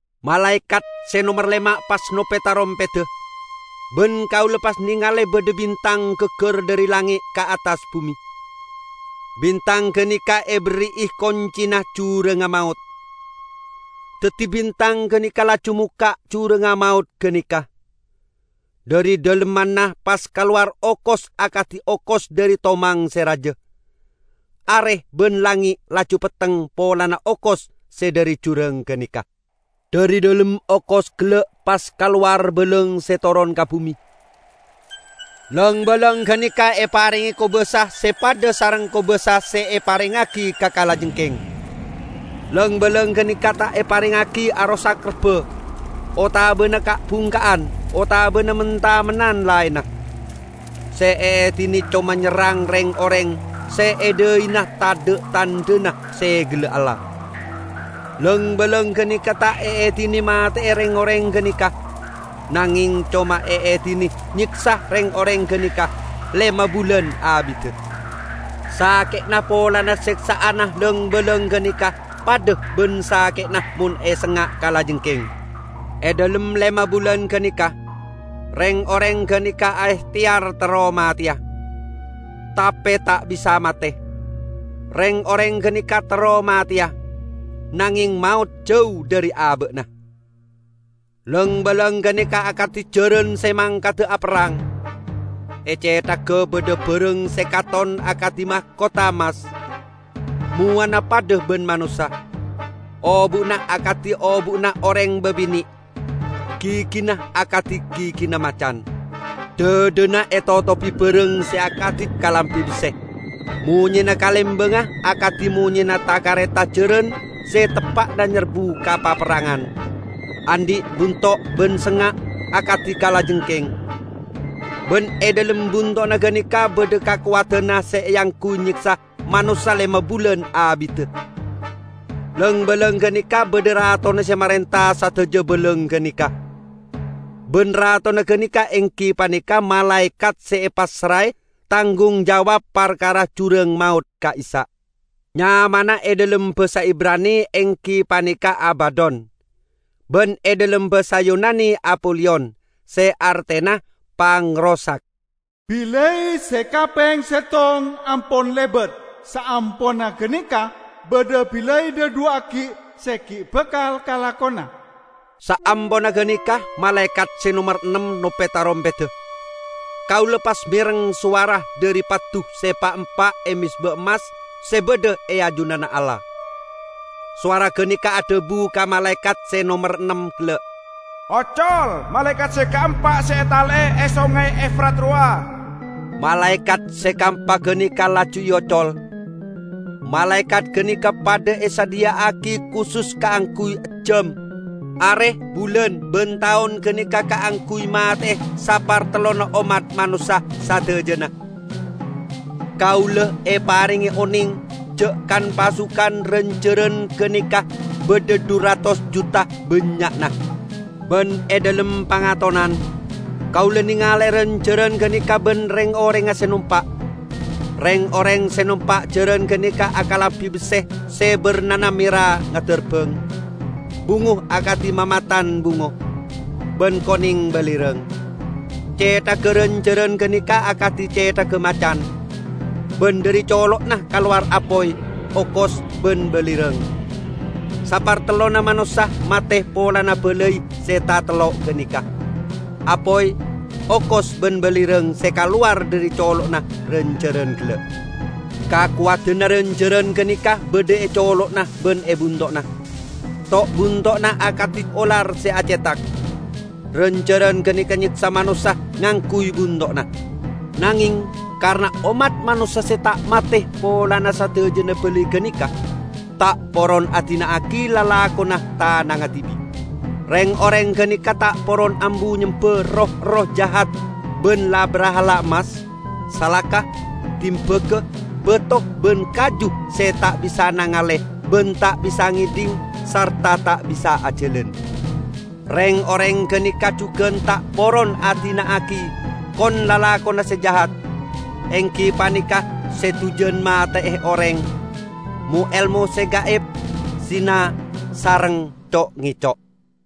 Malaekat se nomer lema' pas nope tarompedda, ban kaula pas nengale badha bintang gaggar dhari langnge' ka attas bume. Bintang ganeka eberri'i koncina jurangnga maot. Daddi bintang ganeka laju mokka' jurangnga maot ganeka; dhari dhalemmanna pas kalowar okos akadi okos dhari tomang se raja. Are ban langnge' laju petteng polana okos se dhari jurang ganeka. Dhari dhalem okos gella' pas kalowar balang se toron ka bume. Lang-balang ganeka eparenge kobasa se padha sareng kobasa se eparengngagi ka kalajengking. Lang-balang ganeka ta' eparengngagi arosak rebba, otabana ka'-bungka'an otabana men-tamennan laenna. Se eedine coma nyerrang reng-oreng se e dhaina tadha' tandhana segella Allah. Lang-balang ganeka ta' eedine mate'e reng-oreng ganeka, nangeng coma eedine nyeksa reng-oreng ganeka lema bulan abidda. Sake'na polana seksa'anna lang-balang ganeka padha ban sake'na mon esengnga' kalajengking. E dhalem lema bulan ganeka, reng-oreng ganeka aehteyar terro mateya, tape ta' bisa mate; reng-oreng ganeka terro mateya, nangeng maot jau dhari aba'na. Lang-balang ganeka akadi jaran se mangkada aperrang. E cethagga badha barang se katon akadi makotha emmas. Mowana padha ban manossa. Obu'na akadi obu'na oreng babine', gigina akadi gigina macan. Dhadhana etotobi barang se akadi kalambi besse. Monyena kalembangnga akadi monyena ta-kareta jaran se teppa'na nyerbu ka paperrangan. Andhi' bunto' ban sengnga' akadi kalajengking. Ban e dhalem bunto'na ganeka badha kakowadanna se eangguy nyeksa manossa lema bulan abidda. Lang-balang ganeka badha ratona se marenta sadaja balang ganeka, ban ratona ganeka enggi paneka malaekat se epassrae tanggung jawab parkara jurang maot ka'issa'. Nyamana e dhalem basa Ibrani enggi paneka Abadon; ban e dhalem basa Yunani Apoliyon (se artena "Pangrosak"). Balai se kapeng settong ampon lebat. Saamponna ganeka badha balai dhadhuwa' aggi' se gi' bakal kalakona. Saamponna ganeka malaekat se nomer ennem nope tarompedda. Kaula pas mereng sowara dhari paddu se pa'-empa' e mezba emmas se badha e ajunanna Allah. Sowara ganeka adhabu ka malaekat se nomer ennem gella'. "Ocol malaekat se kaempa se etale'e e Songay Efrat rowa!" Malaekat se kaempa ganeka laju eocol. Malaekat ganeka padha esadhiya'agi kusus kaangguy ejjam, are, bulan ban taon ganeka kaangguy mate'e sapartellonna ommat manossa sadajana. Kaula eparenge oneng ja' kan-pasukan ran-jaran ganeka badha dhu ratos juta bannya'na. Ban e dhalem pangatonan, kaula nengale ran-jaran ganeka ban reng-orengnga se nompa'. Reng-oreng se nompa' jaran ganeka akalambi besse se barnana mera ngadarbang, bungo akadi mamatan bungo, ban koneng balirang. Cethagga ran-jaran ganeka akadi cethagga macan, ban dhari colo'na kalowar apoy, okos ban balirang. Sapartellonna manossa mate polana balai se tatello' ganeka: apoy, okos ban balirang se kalowar dhari colo'na ran-jaran gella'. Kakowadanna ran-jaran ganeka badha e colo'na ban e bunto'na. To'-bunto'na akadi olar se acethak. Ran-jaran ganeka nyeksa manossa ngangguy bunto'na. Nangeng karena ommat manossa se ta' mate polana sadajana balai ganeka, ta' poron adina'agi lalakonna tanangnga dibi'. Reng-oreng ganeka ta' poron ambu nyemba roh-erroh jahat ban la-brahala emmas, salaka, dimbaga, bato ban kaju se ta' bisa nangale ban ta' bisa ngedhing sarta ta' bisa ajalan. Reng-oreng ganeka jugan ta' poron adina'agi kon-lalakonna se jahat, enggi paneka se dujan mate'e oreng, mo-elmo se gaib, zina sareng co'-ngeco'.